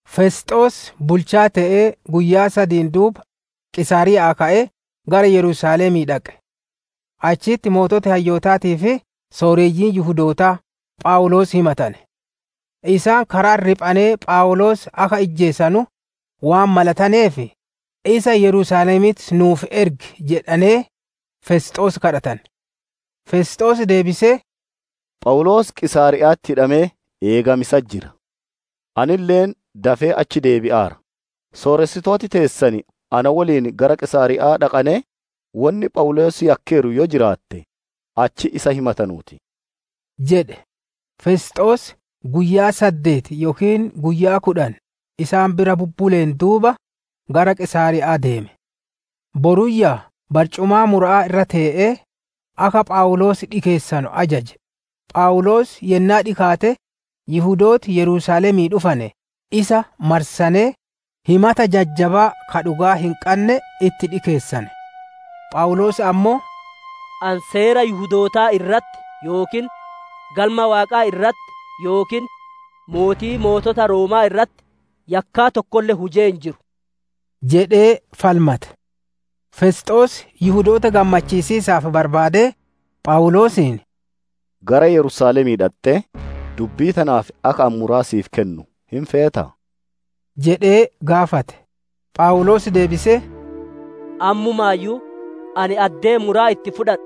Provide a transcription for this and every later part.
Fesxoos bulchaa te'ee guyyaa sadiin duuba, Qiisaariya'aa ka'ee gara Yerusaalemii dhaqe. Achitti sooreyyiin hayyootaatii fi sooreyyiin Yihudootaa, Phawuloos himatane. Isaan kara'atti riphanee Phawuloos akka ijjeesanu waan malataneef, isa Yerusaalemitti nuuf ergi jedhanee, Fesxoos gaafatane. Fesxoos deebisee, «Phawuloos Qiisaariya'atti hidhamee eegamiisatti jira; anille dafee achi deebi'aara. Sooressitooti teessan na woliin gara Qiisaariya'aa dhaqanee, wonni Phawuloos yakkeeru yoo jiraatte, achitti isa himatanuu ti» jedhe. Fesxoos guyyaa saddeeti yookiin guyyaa kudhan isaan bira bubbuleen duuba, gara Qiisaariya'aa deeme; boruyyaa barcumaa mura'aa irra tee'ee, akka Phawuloos dhikeessanu ajaje. Phawuloos yennaa dhikaate, Yihudooti Yerusaalemii dhufane isa marsanee, himata jajjabaa ka dhugaa hin qanne itti dhikeessane. Phawuloos ammoo, «Ani Seera Yihudootaa irratti yookiin Galma Waaqaa irratti yookiin Mootii Mootota Rooma'aa irratti yakkaa tokkolle hujee hin jiru» jedhee falmate. Fesxoos Yihudoota gammachiisiisaaf barbaadee, Phawuloosiin, «Gara Yerusaalemii dhaxxee, dubbii tanaaf akka ani muraa siif kennu hin feetaa?» jedhee gaafate. Phawuloos deebisee, «Ammumaayyuu ani addee muraa itti fudhadhu,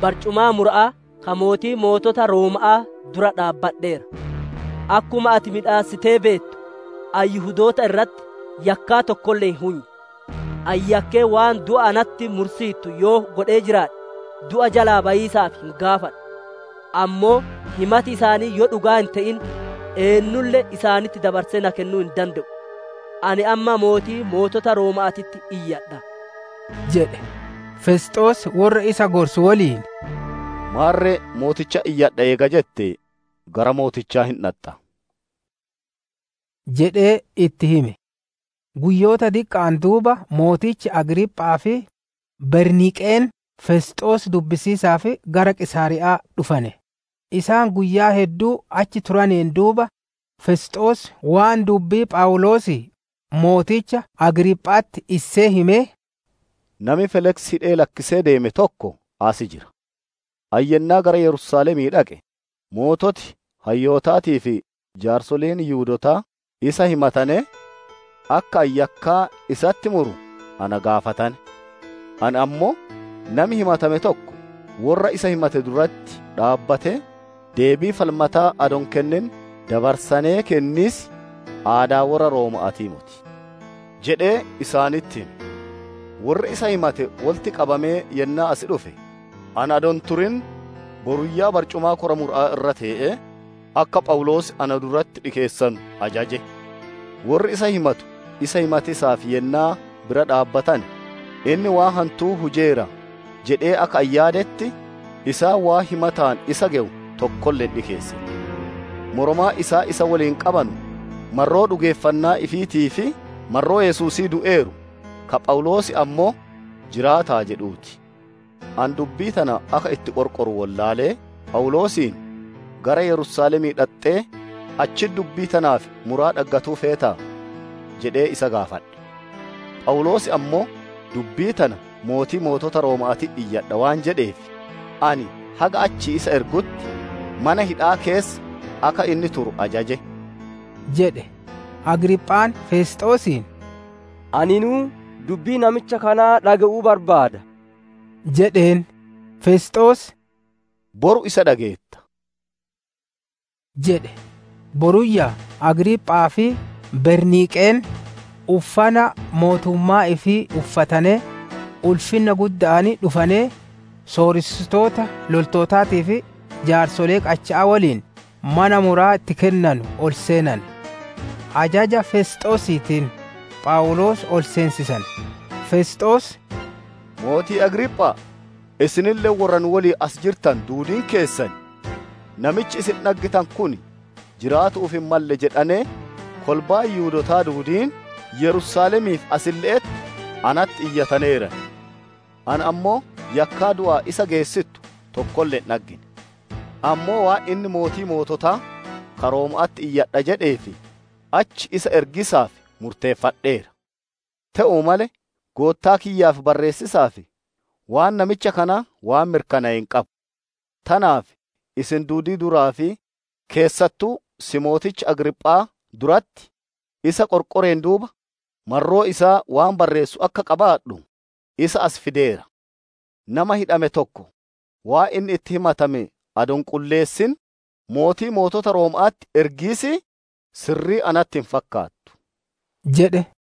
barcumaa mura'aa ka Mootii Mootota Rooma'aa dura dhaabbadheera. Akkuma ati miidhassitee beettu, ani Yihudoota irratti yakkaa tokkolle hin hunye. Ani yakkee waan du'a natti mursiittu yoo godhee jiraadhe, du'a jalaa bayiisaaf hin gaafadhu. Ammoo himati isaanii yoo dhugaa hin te'in, eennulle isaanitti dabarsee na kennuu hin dande'u. Ani amma Mootii Mootota Rooma'aatitti iyyadha» jedhe. Fesxoos worra isa gorsu woliin mari'atee, «Maarre mootichatti iyyadha eega jette, gara mootichaa hin dhaxxa» jedhee itti hime. Guyyoota diqqa'aan duuba mootichi Agriipha'aa fi Berniiqeen, Fesxoos dubbisiisaaf gara Qiisaariya'aa dhufane. Isaan guyyaa hedduu achi turaneen duuba, Fesxoos waan dubbii Phawuloosii mooticha Agriipha'atti issee himee, «Nami Feeliksi hidhee lakkisee deeme tokko as jira; ani yennaa gara Yerusaalemii dhaqe, sooreyyiin hayyootaatii fi jaarsoleen Yihudootaa isa himatanee, akka ani yakkaa isatti muru na gaafatane. Ani ammoo, ‹Nami himatame tokko worra isa himatu dura dhaabbatee, deebii falmataa adoo hin kennin dabarsanee kenniis, aadaa worra Rooma'aatii moti› jedhee isaanitti hime. Worri isa himate wolitti qabamee yennaa as dhufe, ani adoo hin turin, boruyyaa barcumaa kora mura'aa irra tee'ee, akka Phawuloos na duratti dhikeessanu ajaje. Worri isa himatu isa himatiisaaf yennaa bira dhaabbatane, inni waan hantuu hujeera jedhee akka ani yaadetti, isaan waan himataan isa gewu tokkolle hin dhikeessine. Moromaan isaan isa woliin qabanu marroo dhugeeffannaa ifiitii fi marroo Yesuusii du'eeru, ka Phawuloos ammoo, ‹Jiraata'a› jedhuu ti. Ani dubbii tana akka itti qorqoru wollaalee, Phawuloosiin, ‹Gara Yerusaalemii dhaxxee, achitti dubbii tanaaf muraa dhaggatuu feetaa› jedhee isa gaafadhe. Phawuloos ammoo, dubbii tana Mootii Mootota Rooma'aatitti iyyadha waan jedheef, ani haga achii isa ergutti, mana hidha'aa keessa akka inni turu ajaje» jedhe. Agriiphaan Fesxoosiin, «Aninuu dubbii namicha kanaa dhage'uu barbaada» jedheen. Fesxoos, «Boru isa dhageetta» jedhe. Boruyyaa Agriiphaa fi Berniiqeen, uffana mootummaa ifii uffatanee, ulfinna gudda'aan dhufanee, sooressitoota loltootaatii fi jaarsolee qacha'aa woliin, mana muraa itti kennanu ol seenane. Ajaja Feesxoosiitiin, Phawuloos ol seensisane. Fesxoos, «Mootii Agriipha'a! Isinille worra nu woliin as jirtanu duudiin keessan! Namichi isin dhaggitanu kun, jiraatu'uuf hin malle jedhanee, kolbaan Yihudootaa duudiin Yerusaalemii fi asille'etti natti iyyataneeran. Ani ammoo yakkaa du'aan isa geessittu tokkolle hin dhaggine. Ammoo waan inni Mootii Moototaa, ka Rooma'aatitti iyyadha jedheef, achi isa ergiisaaf murteeffadheera. Te'uu malee goottaa kiyyaaf barreessiisaaf, waan namicha kanaa waan mirkanaaye hin qabu. Tanaaf isin duudii duraa fi keessattuu si'i mooticha Agriiphaa duratti, isa qorqoreen duuba marroo isaa waan barreessu akka qabaadhu, isa asi fideera. Namaa hidhame tokko, waan inni itti himatame adoo hin qulleessin, Mootii Mootota Rooma'aatitti ergiisii, sirrii natti hin fakkaattu» jedhe.